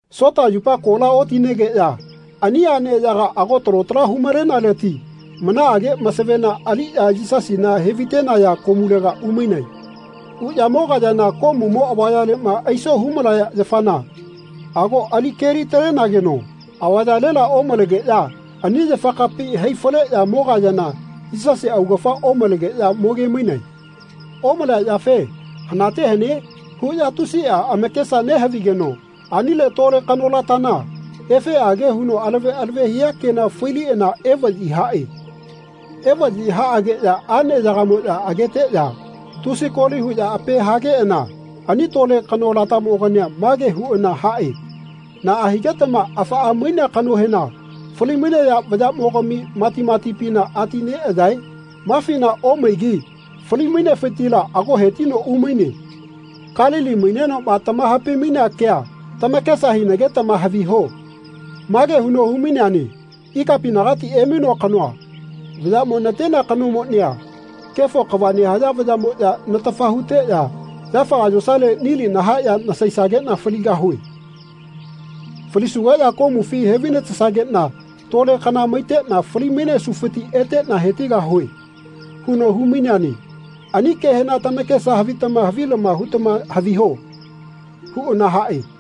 Sota yupa kola otinegeꞌya ani aꞌneyaga ago talo tala humalenaleti manaꞌage masavena aliꞌya Yisasina hevaitenaya komulega umainae. Uꞌya mogayana komumo avayaleꞌma aiso humalaya yafana ago alikeli-talenageno avayalela omalegeꞌya ani yafakapi hai faleꞌya mogayana Yisasi augafa omalegeꞌya mogemainae. Omalea yafe “Hanate hane?” huꞌya tusiꞌa amakesa nehavigeno anile tole kanolatana efeꞌage huno alave alave hia kena failiꞌana evaꞌyi haꞌe. Evaꞌyi haꞌageꞌya aꞌneyagamoꞌya ageteꞌya tusi koli huꞌya ape hageꞌana ani tole kanolatamogania mage huꞌana haꞌe “Naꞌa higetama afaꞌa mainea kanohena falimainaya vayaꞌmogami matimatipina ati neꞌayae? Mafina omaigi fali-mainefitila ago hetino umaine. Kalili mainenoꞌma tamahapai-mainea kea tamakesa hinagetama haviho. Mage huno humaineane ‘Ikapinagati emainoa kanoa vayaꞌmo natenea kanomonia kefo kava nehaya vayaꞌmoꞌya natafa huteꞌya yafaga yosale nili nahaeꞌya nasaisageꞌna faligahue. Falisugeꞌya komufi hevainatesageꞌna tole kana maiteꞌna fali-mainesufiti eteꞌna hetigahue.’ huno humaineane. Ani kehena tamakesa havitama havilama hutama haviho.” huꞌana haꞌe.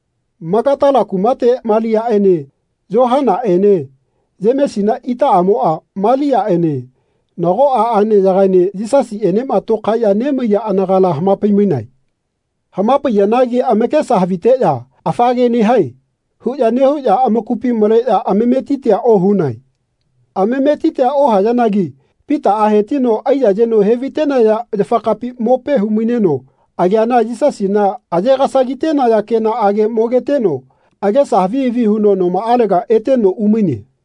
Magatala kumate Maliaꞌene Yohanaꞌene Yemesina itaꞌamoꞌa Maliaꞌene nagoꞌa aꞌneyagaene Yisasiꞌenema tokaeꞌya nemaiya anagala hamapai-mainae. Hamapaiyanagi amakesa haviteꞌya “Afa ke nehae.” huꞌya nehuꞌya amakupi maleꞌya amametitia ohunae. Amametitia ohayanagi Pitaꞌa hetino aiyayeno hevaitenaya yafakapi mope humaineno ageana Yisasina aye-gasagitenaya kenaꞌage mogeteno agesa havi havi huno nomaꞌalega eteno umaine.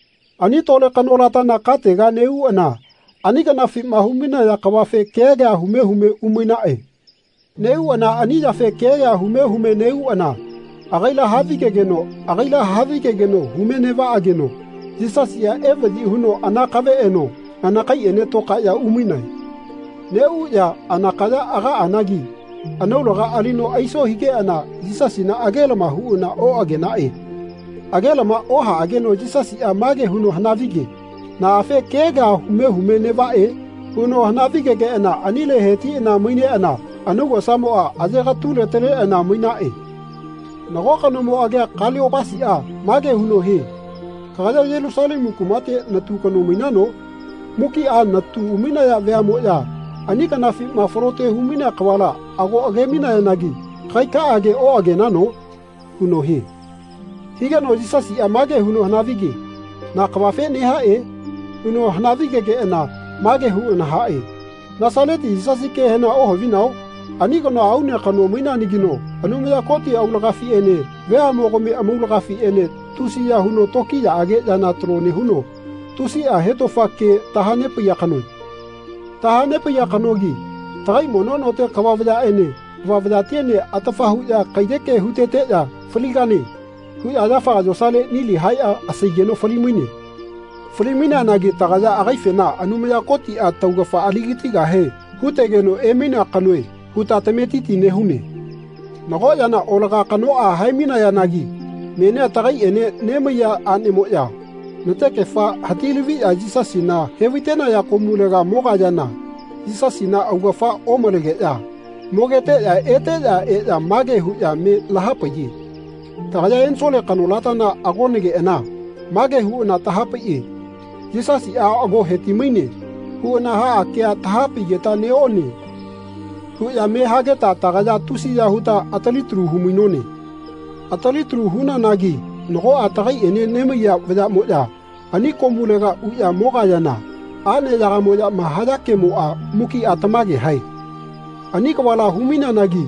Ani tole kanolatana katega neꞌuꞌana ani kanafima humainaya kavafe kea kea hume hume umainaꞌe. Neꞌuꞌana ani yafe kea kea hume hume neꞌuꞌana agaila havigegeno agaila havigegeno hume neꞌvaꞌageno Yisasiꞌa evaꞌyi huno anakave eno anakaiꞌene tokaeꞌya umainae. Neꞌuꞌya anakaya agaꞌanagi anaulaga alino aiso higeꞌana Yisasina agelama huꞌana oꞌagenaꞌe. Agelama ohaꞌageno Yisasiꞌa mage huno hanavige “Naꞌafe kea kea hume hume neꞌvaꞌe?” huno hanavigegeꞌana anile hetiꞌana maineꞌana anaugosa ayegatule-taleꞌana mainaꞌe. Nago kanomo agia Kaliopasiꞌa mage huno hie “Kagaya Yelusalemu kumate natu kano mainano? Mukiꞌa natu umainaya veaꞌmoꞌya ani kanafima falote humainea kavala ago agemainayanagi kagaikage oꞌagenano?” huno hie. Higeno Yisasiꞌa mage huno hanavige “Na kavafe nehaꞌe?” huno hanavi-gegeꞌana mage huꞌana haꞌe “Nasaleti Yisasi kehena ohavino? Ani kanoa aune kano maineanagino Anumaya Koti aulagafiꞌene veaꞌmogami amaulagafiꞌene tusiya huno tokiyaꞌage yana talo nehuno tusiꞌa hetofa ke tahanepaiya kanoe. Tahanepaiya kanogi tagai mono note kava vayaꞌene kava vayatiene atafa huꞌya kaiyeke huteteꞌya ‘Faligane.’ huꞌya yafaga yosale nili haeꞌya asaigeno falimaine. Fali-maineanagi tagaya agaifena Anumaya Kotiꞌa taugafa aligatigahe hutegeno emainea kanoe huta tametiti nehune. Nago yana olaga kanoꞌa hae-mainayanagi menia tagaiꞌene nemaiya aꞌnemoꞌya natekefa hatilaviꞌya Yisasina hevaitenaya komulega mogayana Yisasina augafa omalegeꞌya mogeteꞌya eteꞌya eꞌya mage huꞌya me lahapaiye ‘Tagaya ensole kanolata agonageꞌana mage huꞌana tahapaiꞌe ‘Yisasiꞌa ago hetimaine.’ huꞌana haꞌa kea tahapaigeta neꞌone.’ huꞌya me hageta tagaya tusiya huta atalitalu humainone. Atalitalu hunanagi nagoꞌa tagaiꞌene nemaiya vayaꞌmoꞌya ani komulega uꞌya mogayana aꞌneyagamoꞌyama haya kemoꞌa mukiꞌa tamage hae. Ani kavala humaineanagi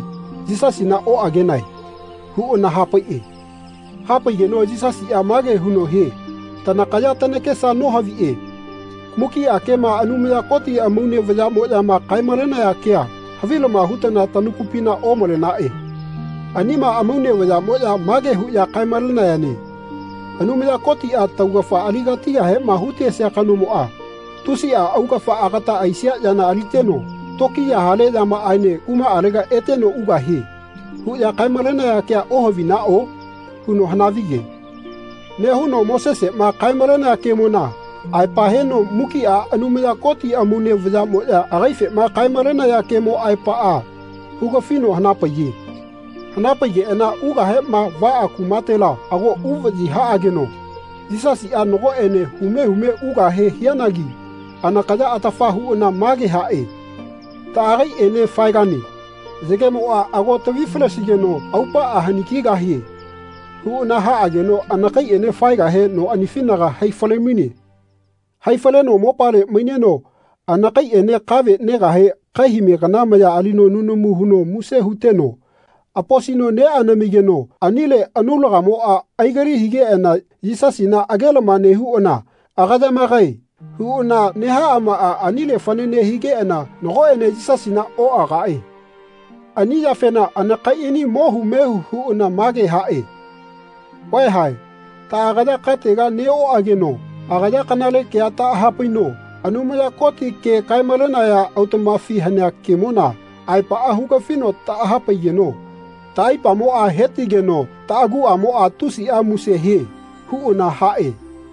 Yisasina oꞌagenae.” huꞌana hapaiꞌe. Hapaigeno Yisasiꞌa mage huno hie “Tanakaya tanakesa nohaviꞌe. Mukiꞌa kema Anumaya Koti amaune vayaꞌmoꞌyama kae-malenaya kea havilama hutana tanakupina omalenaꞌe. Anima amaune vayaꞌmoꞌya mage huꞌya kae-malenayane ‘Anumaya Kotiꞌa taugafa aligatigahema hutesia kanomoꞌa tusiꞌa augafa agata aisia yana aliteno tokiya hale yamaꞌaene kumaꞌalega eteno ugahie.’ huꞌya kae-malenaya kea ohavinaꞌo?” huno hanavige. Nehuno Moseseꞌma kae-malenea kemona aepa heno mukiꞌa Anumaya Koti amaune vayaꞌmoꞌya agaifema kae-malenaya kemo aepaꞌa hugafino hanapaiye. Hanapaigeꞌana ugahema vaꞌa kumatela ago uvaꞌyi haꞌageno Yisasiꞌa nagoꞌene hume hume ugahe hianagi anakaya atafa huꞌana mage haꞌe “Taꞌagaiꞌene faegane. Yagemoꞌa ago tavifalesigeno aupaꞌa hani kigahie.” huꞌana haꞌageno anakaiꞌene faigahe noꞌanifinaga haifalemaine. Haifaleno mopale maineno anakaiꞌene kave negahe kaihame kana maya alino nunamu huno muse huteno aposino neꞌanamigeno anile anaulagamoꞌa aigali higeꞌana Yisasina agelama nehuꞌana “Agayamagae.” huꞌana nehaꞌamaꞌa anile fanane higeꞌana nagoꞌene Yisasina noꞌagaꞌe. Ani yafena anakaiꞌani mohu mehu huꞌana mage haꞌe “Vaeha taꞌagaya katega neꞌoꞌageno agaya kanale kea taꞌahapaino Anumaya Koti ke kae-malenaya autaꞌmafi hanea kemona aepaꞌa hugafino taꞌahapaigeno taꞌaipamoꞌa hetigeno taꞌaguꞌamoꞌa tusiꞌa muse hie.” huꞌana haꞌe.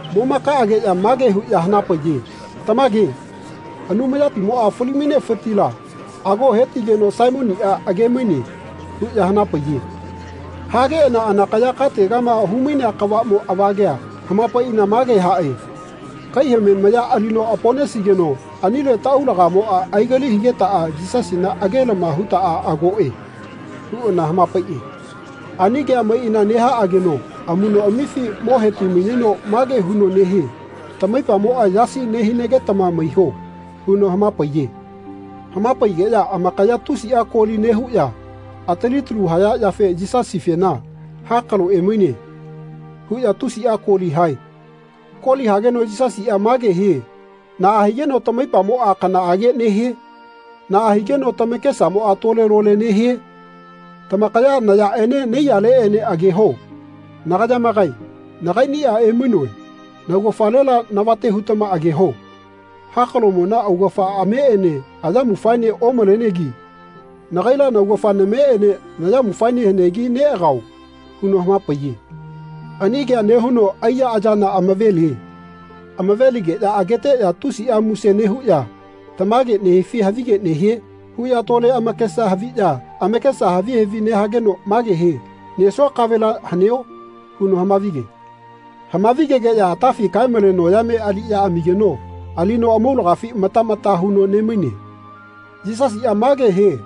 Momakaꞌageꞌya mage huꞌya hanapaiye “Tamage Anumayatimoꞌa fali-mainefitila ago hetigeno Saimoniꞌa agemaine.” huꞌya hanapaiye. Hageꞌana anakaya kategama humainea kavaꞌmo avagea hamapaiꞌana mage haꞌe “Kaihame maya alino aponesigeno anile taꞌaulagamoꞌa aigali higetaꞌa Yisasina agelama hutaꞌa agoꞌe.” huꞌana hamapaiꞌe. Ani kea maiꞌana nehaꞌageno amuꞌnoꞌamifi mo hetimaineno mage huno nehie “Tamaipamoꞌa yasi nehinagetama maiho.” huno hamapaiye. Hamapaigeꞌya amakaya tusiꞌa koli nehuꞌya atalitalu haya yafe Yisasifena “Hakalo emaine.” huꞌya tusiꞌa koli hae. Koli hageno Yisasiꞌa mage hie “Naꞌa higeno tamaipamoꞌa kanaꞌage nehie? Naꞌa higeno tamakesamoꞌa tole-lole nehae? Tamakaya nayaꞌene naiyaleꞌene ageho. Nagayamagae nagaiꞌniꞌa emainoe. Naugafalela navate hutama ageho. Hakaloꞌmona augafa ameꞌene ayamufaene omalenegi nagaila naugafa nameꞌene nayamufaene hanegi neꞌagao.” huno hamapaiye. Ani kea nehuno aiya ayana amavelie. Amaveligeꞌya ageteꞌya tusiꞌa muse nehuꞌya “Tamage nehifi havige nehie?” huꞌya tole amakesa haviꞌya amakesa havi havi nehageno mage hie “Nesua kavela haneo?” huno hamavige. Hamavi-gegeꞌya atafi kaemale noyame aliꞌya amigeno alino amaulagafi mata mata huno nemaine. Yisasiꞌa mage hie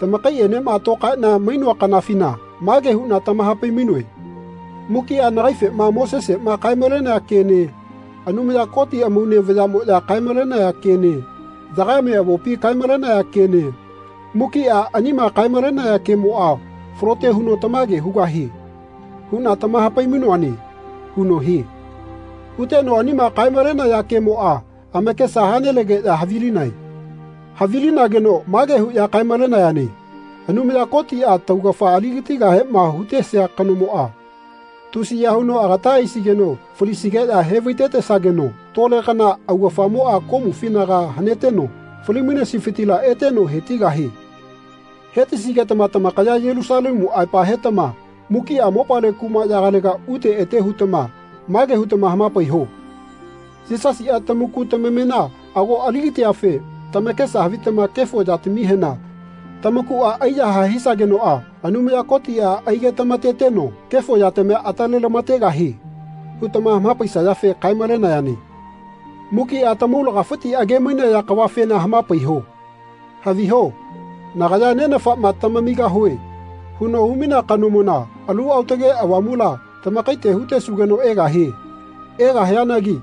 “Tamakaiꞌenema tokaeꞌna mainoa kanafina mage huꞌna tamahapai-mainoe ‘Mukiꞌa nagaifema Moseseꞌma kae-malenea kene Anumaya Koti amaune vayaꞌmoꞌya kaemalenaya kene Yagame Avopi kaemalenaya kene mukiꞌa anima kae-malenaya kemoꞌa falote huno tamage hugahie.’ huꞌna tamahapai-mainoane.” huno hie. Huteno anima kae-malenaya kemoꞌa amakesa halenegeꞌya havilinae. Havilinageno “Mage huꞌya kae-malenayane ‘Anumaya Kotiꞌa tamaugafa aligatigahema hutesia kanomoꞌa tusiya huno agata aisigeno falisigeꞌya hevaitetesageno tole kana augafamoꞌa komufinaga haneteno fali-mainesifitila eteno hetigahie.’ Hetisigetama tamakaya Yelusalemu aepa hetama mukiꞌa mopale kumaꞌyagalega ute ete hutama mage hutama hamapaiho ‘Yisasiꞌa tamaku tamamena ago aligatiafe tamakesa havitama kefo yatamihena tamakuꞌa aiyahae hisagenoꞌa Anumaya Kotiꞌa aigetamateteno kefo yatamia atalelamategahie.’ hutama hamapaisayafe kae-malenayane. Mukiꞌa tamaulagafiti agemainaya kavafena hamapaiho. Haviho nagaya Nenafaꞌma ‘Tamamigahue.’ huno humainea kanomona Alu Aotage Avamula tamakaite hutesugeno egahie. Egahianagi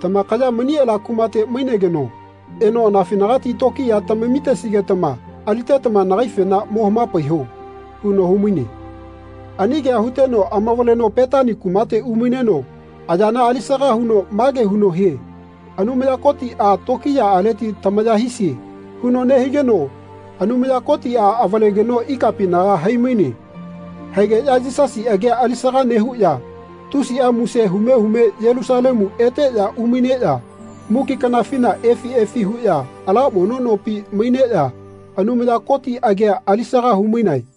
tamakaya mani ala kumate mainegeno eno anafinagati tokiya tamamisigetama alitetama nagaifena mo hamapaiho.” huno humaine. Ani kea huteno amavaleno Petani kumate umaineno ayana alisaga huno mage huno hie “Anumaya Kotiꞌa tokiyaꞌaleti tamaya hisie.” huno nehigeno Anumaya Kotiꞌa avalegeno ikapinaga haimaine. Haigeꞌya Yisasi agia alisaga nehuꞌya tusiꞌa muse hume hume Yelusalemu eteꞌya umaineꞌya muki kanafina efi efi huꞌya ala mono nopi maineꞌya Anumaya Koti agia alisaga humainae.